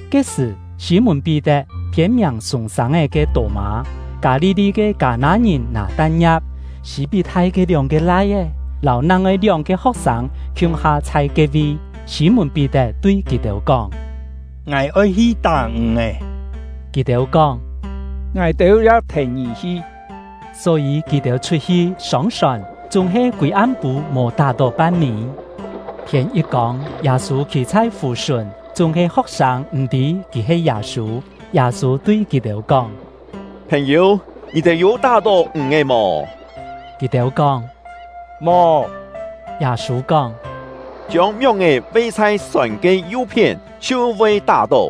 Ke-sṳ̀, Sî-mùn-Pí-tet, phiên-miàng Sûng-sâng-é ke Tô-mâ, Kâ-li-li ke Kâ-nâ-ngìn Nâ-tan-ngia̍p, Sî-pí-thai ke lióng-ke lai-é, lâu nang-ngoi lióng-ke ho̍k-sâng khiung-ha chhai ke-vi. Sî-mùn-Pí-tet tui kì-têu kóng: “Ngài oi hi tá ǹg-è.” Kì-têu kóng: “Ngài-têu ya thèn ngì hi.” Só-yî kì-têu chhut-hi, sông-sòn; chúng-he kûi am-pû mò tá-tó pan-mî. Thiên yit kông, Yâ-sû khî chhai fù-sùn, chúng-he ho̍k-sâng m̀-tî kì he Yâ-sû. Yâ-sû tui kì-têu kóng: “Phèn-yû, ngì-têu yû tá-tó ǹg-è mò?” Kì-têu kóng: “Mò.” Yâ-sû kóng: “Chiông mióng-è ve chhai sòn ke yu-phién, chhiu voi tá-tó.”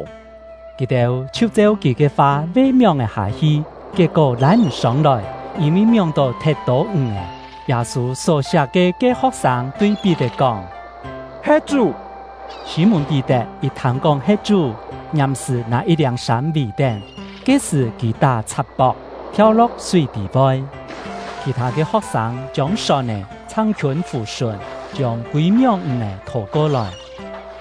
Kì-têu chhiu cheu kì ke fa ve mióng-è hâ-hi, kiet-kó lâi m̀ sông-lòi, yîn-vi mióng-tó thet tô ǹg-è. Yâ-sû só-siak ke ke ho̍k-sâng tui Pí-tet kóng: “He Chú!” Sî-mùn-Pí-tet yit thâng-kóng he Chú, ngiàm-sṳ̀ nâ yit-liâng sâm vì-tén (ke-sṳ̀ kì tá-chhak-pok), thiau-lo̍k súi tî-poi. Khì-thâ ke ho̍k-sâng chiông sòn-è chhang-khiûn fù-sùn, chiông kûi mióng ǹg-è thô-ko-lòi.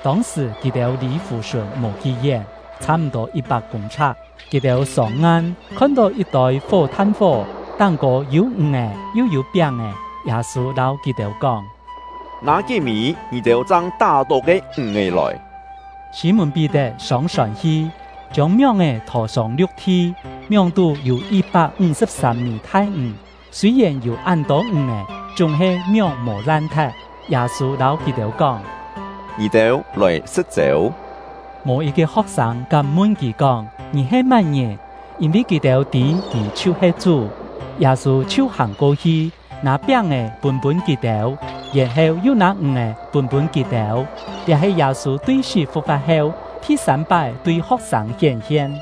Tông-sṳ̀ kì-têu lì fù-sùn mò kí-yén, chhâ-m̀-tô yit-pak kûng-chhak. Kì-têu sông-ngan, khon-tó yit-tôi fó-than-fó, táng-kô yû ǹg-è, yu yû piáng-è. Yâ-sû lâu kì-têu kóng: “Nâ kí-mî ngì-têu chang tá-tó ke ǹg-è lòi.” Sî-mùn-Pí-tet sông-sòn hi, chiông mióng-è thô-sông liu̍k-thi; mióng-tú yû yit-pak ńg-sṳ̍p-sâm-mî thai-ǹg. Sûi-yèn yû án tô ǹg-è, chúng-he mióng mò lan-thet. Yâ-sû lâu kì-têu kóng: “Ngì-têu lòi sṳ̍t-chêu.” Mò yit-ke ho̍k-sâng kám mun kì kóng: “Ngì he má-ngìn?” yîn-vi kì-têu tî kì chhiu-he Chú. Yâ-sû chhiu hàng ko-hi, nâ piáng-è pûn-pûn kì-têu, yèn-heu yu nâ ǹg-è pûn-pûn kì-têu. Liá he Yâ-sû tui sí fu̍k-fa̍t heu, thi-sâm-pái tui ho̍k-sâng hién-hien.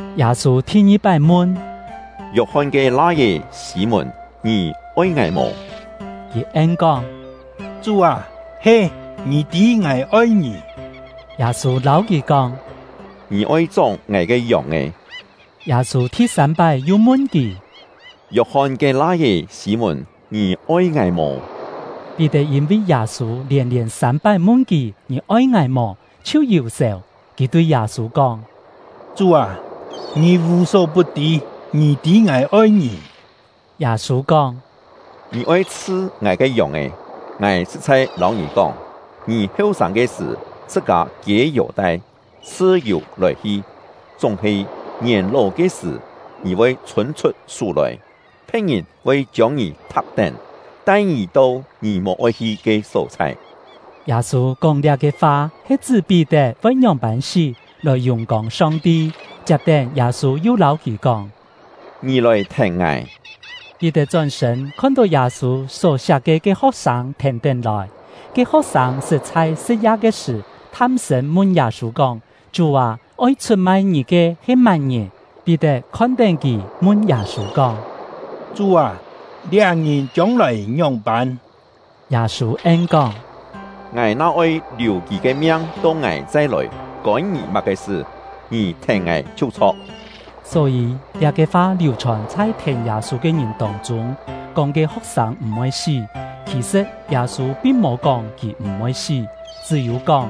Yâ-sû thi-ngi-pái mun: “Yok-hon ke lai-é Sî-mùn, ngì oi ngài mò?” Kì en-kóng: “Chú â, he, ngì tî ngài oi ngì.” Yâ-sû lâu kì kóng: “Ngì oi chóng ngài ke yòng-è.” Yâ-sû thi-sâm-pái yu mun kì: “Yok-hon ke lai-é Sî-mùn, ngì oi ngài mò?” Pí-tet yîn-vi Yâ-sû lièn-lièn sâm-pái mun kì, “Ngì oi ngài mò?” chhiu yù-sèu; kì tui Yâ-sû kóng: “Chú â, ngì vù-só-put-tî, ngì tî ngài oi ngì.” Yâ-sû kóng: “Ngì oi chhṳ ngài ke yòng-è. Ngài sṳ̍t-chhai lâu ngì kóng, ngì heu-sâng ke sṳ̀, chhṳ-kâ kiê yêu-tai, chhṳ-yù lòi-hi; chúng-he ngièn-ló ke sṳ̀, ngì voi chhûn-chhut sú lòi, phe̍t-ngìn voi chiông ngì thak-tén, tai ngì to ngì mò-oi hi ke só-chhai.” (Yâ-sû kóng liá-ke fa he chṳ́ Pí-tet voi ngióng-pân sí, lòi yùng-kông Song-ti.) Chiap-tén, Yâ-sû yu lâu kì kóng: “Ngì lòi thèn ngài!” Pí-tet chón-sṳ̂n, khon-tó Yâ-sû só-siak ke ke ho̍k-sâng thèn-tén lòi. (Ke ho̍k-sâng sṳt chhai sṳ̍t-ya ke sṳ̀ tham-sṳ̂n mun Yâ-sû kóng: “Chú â, oi chhut-mai ngì ke he má-ngìn?”) Pí-tet khon-tén kì, mun Yâ-sû kóng: “Chú â, liá ngìn chiông-lòi ngióng-pân?” Yâ-sû en-kóng: “Ngài na oi liù kì ke miang to ngài chai lòi, kôn ngì má-ke sṳ? Ngì thèn ngài chhiu chho̍k!” Só-yî, liá-ke fa liù-chhòn chhai thèn Yâ-sû ke ngìn tông-chûng, kóng ke ho̍k-sâng m̀-voi sí. Khì-sṳ̍t, Yâ-sû pin mò kóng kì m̀-voi sí, chṳ́-yû kóng: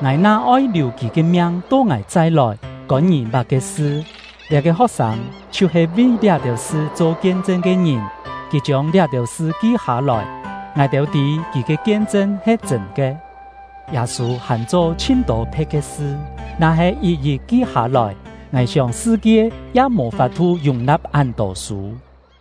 “Ngài na oi liù kì ke miang to ngài chai lòi, kôn ngì má-ke sṳ?” Liá-ke ho̍k-sâng chhiu-he vi liá-têu sṳ cho kien-chṳn ke ngìn; kì chiông liá-têu sṳ ki hâ-lòi. Ngài-têu tî kì ke kien-chṳn he chṳ̂n ke. Yâ-sû hàn cho chhin-tô phe̍t ke sṳ, na-he yit-yit ki hâ-lòi, ngài sióng sṳ-kie ya mò fap-thu yùng-na̍p án-tô sû.